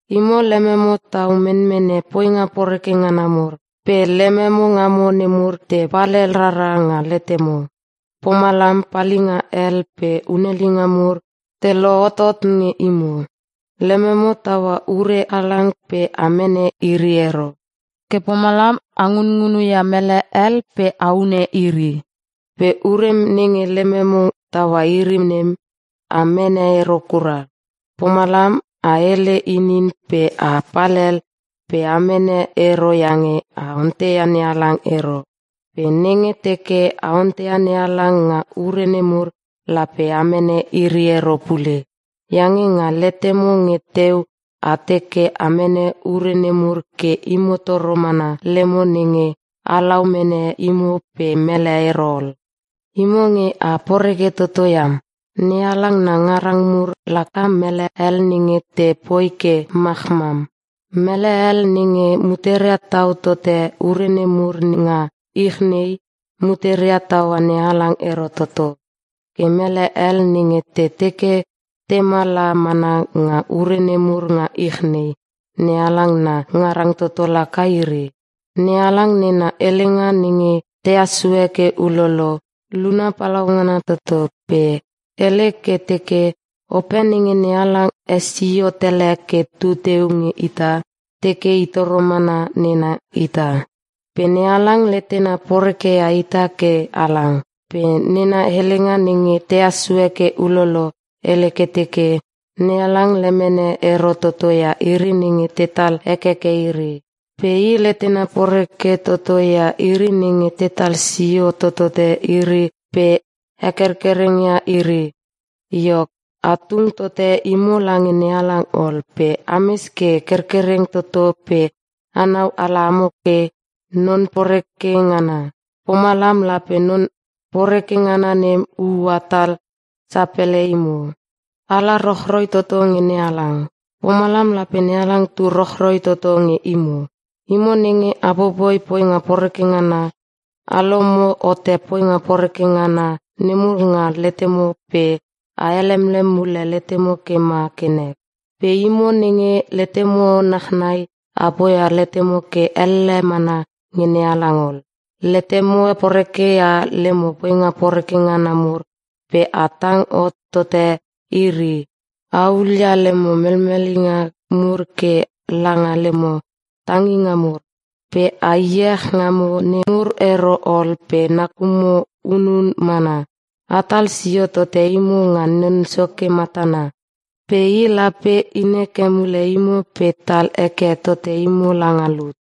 Imo, lememo tau menmene poinga poreke ngana mur, pe lememo ngamo nemur te palhel rara nga letemo. Pomalam, palinga hel pe hunelinga mur te lohotot nge imo. Lememo taua ure halang pe a mene iri ero. Ke pomalam a ngunngunu ia mele hel pe a hune iri. Pe ure nenge lememo taua iri nem, a mene ero kura. Pomalam, a hele inin pe a palhel pe a mene ero iange a onteia NeHalang ero. Pe nenge teke a onteia NeHalang nga ure nemur, lape a mene iri ero pule. Iange nga letemo nge teu a teke a mene ure nemur ke imo toro mana lemo nenge halau mene imo pe mele ero ol. Imo nge a poreke toto iam! NeHalang na ngarang mur laka mele hel nenge te poi ke machmam. Mele hel nenge muteria tau tote ure nemur nga ich nei, muteria taua NeHalang ero toto. Ke mele hel nenge te teke tema la mana nga ure nemur nga ich nei, NeHalang na ngarang toto laka iri. NeHalang nena helenga nenge tehas sue ke ulolo, luna palaungana toto, pe hele ke teke, “Ope nenge NeHalang hesio tele ke tu teu nge ita, teke i toro mana nena ita.” Pe NeHalang letena porekeia ita ke halang. Pe nena helenga nenge tehas sue ke ulolo, hele ke teke, “NeHalang lemene ero toto ia iri nenge tetal hekeke iri. Pe I letena poreke toto ia iri nenge tetal sio totote iri pe hekerkereng ia iri.” Iok, a tung tote imo lange NeHalang ol pe ames ke kerkereng toto pe anau ala amo nge non poreke ngana. Pomalam lape non poreke ngana nem ua hatal sapele imo. Ala rochroi toto nge NeHalang. Pomalam, lape NeHalang tu rochroi toto nge imo. Imo nenge a popoi poinga poreke ngana, a lomo hote poinga poreke ngana nemur nga letemo pe a helemlem mule letemo ke ma ke nek. Pe imo nenge letemo nachnai a poia letemo ke elle mana nge NeHalang ol. Letemo poreke ia lemo poinga poreke ngana mur pe a tang hot tote iri! A hulia lemo melmelinga mur ke langa lemo tanginga mur. Pe a iech ngamo nem mur ero ol pe nakumo hunun mana. Atal sio tote imo nga Non Soke matana, pe I lape inheke mule imo pe tal heke tote imo langa lut.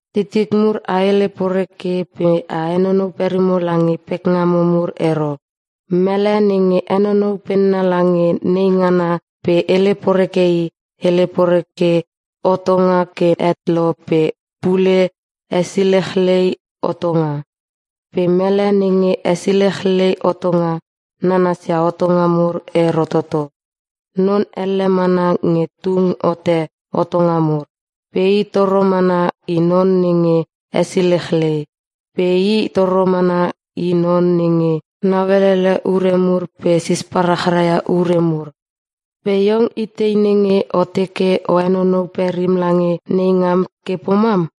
Titik mur, a hele poreke pe a henonou perimo lange neingamo mur ero. Mele nenge henonou penna lange neingana pe hele poreke i, hele poreke hotonga ke het lo pe pule, hesilechlei hotonga. Pe mele nenge hesilechlei hotonga, nanasia hotonga mur ero toto. Non elle mana nge tung hote hotonga mur. Pe I toro mana i non nenge hesilechlei. Pe i toro mana i non nenge nauelele ure mur pe sisparachraia ure mur. Pe iong itei nenge o teke o henonou perim lange neingam ke pomam?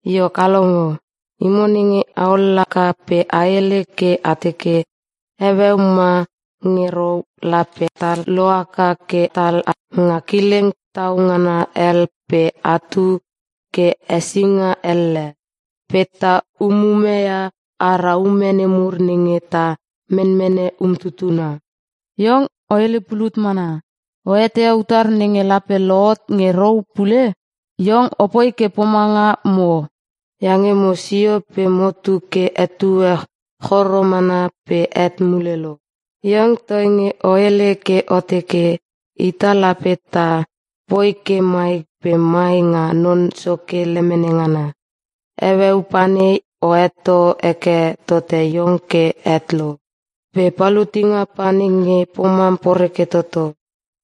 Iok a longo, imo nenge a lohaka pe a hele ke a teke, “Heueu ma nge rou, lape ta lohaka ke tala nga kileng tau ngana hel pe tatu ke hesinga elle. Pe ta umumeia ara ume nemur nenge ta menmene umtutuna.” Iong o hele pulut mana. O eteia utar nenge lape lohot nge rou pule? Iong opoi ke pomanga mo. Iange mo sio pe tu ke etue choro mana pe het mule lo. Iong, toinge o hele ke o teke, “Ita lape ta poi ke mai pe mai nga Non Soke lemene ngana.” Heueu panei o heto heke tote iong ke het lo. Pe palutinga pa nenge pomam poreke toto.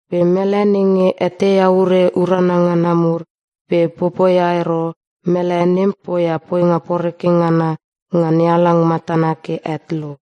Pe mele nenge eteia ure urana ngana mur pe popoia ero, mele nem poia poinga poreke ngana nga NeHalang matana ke het lo.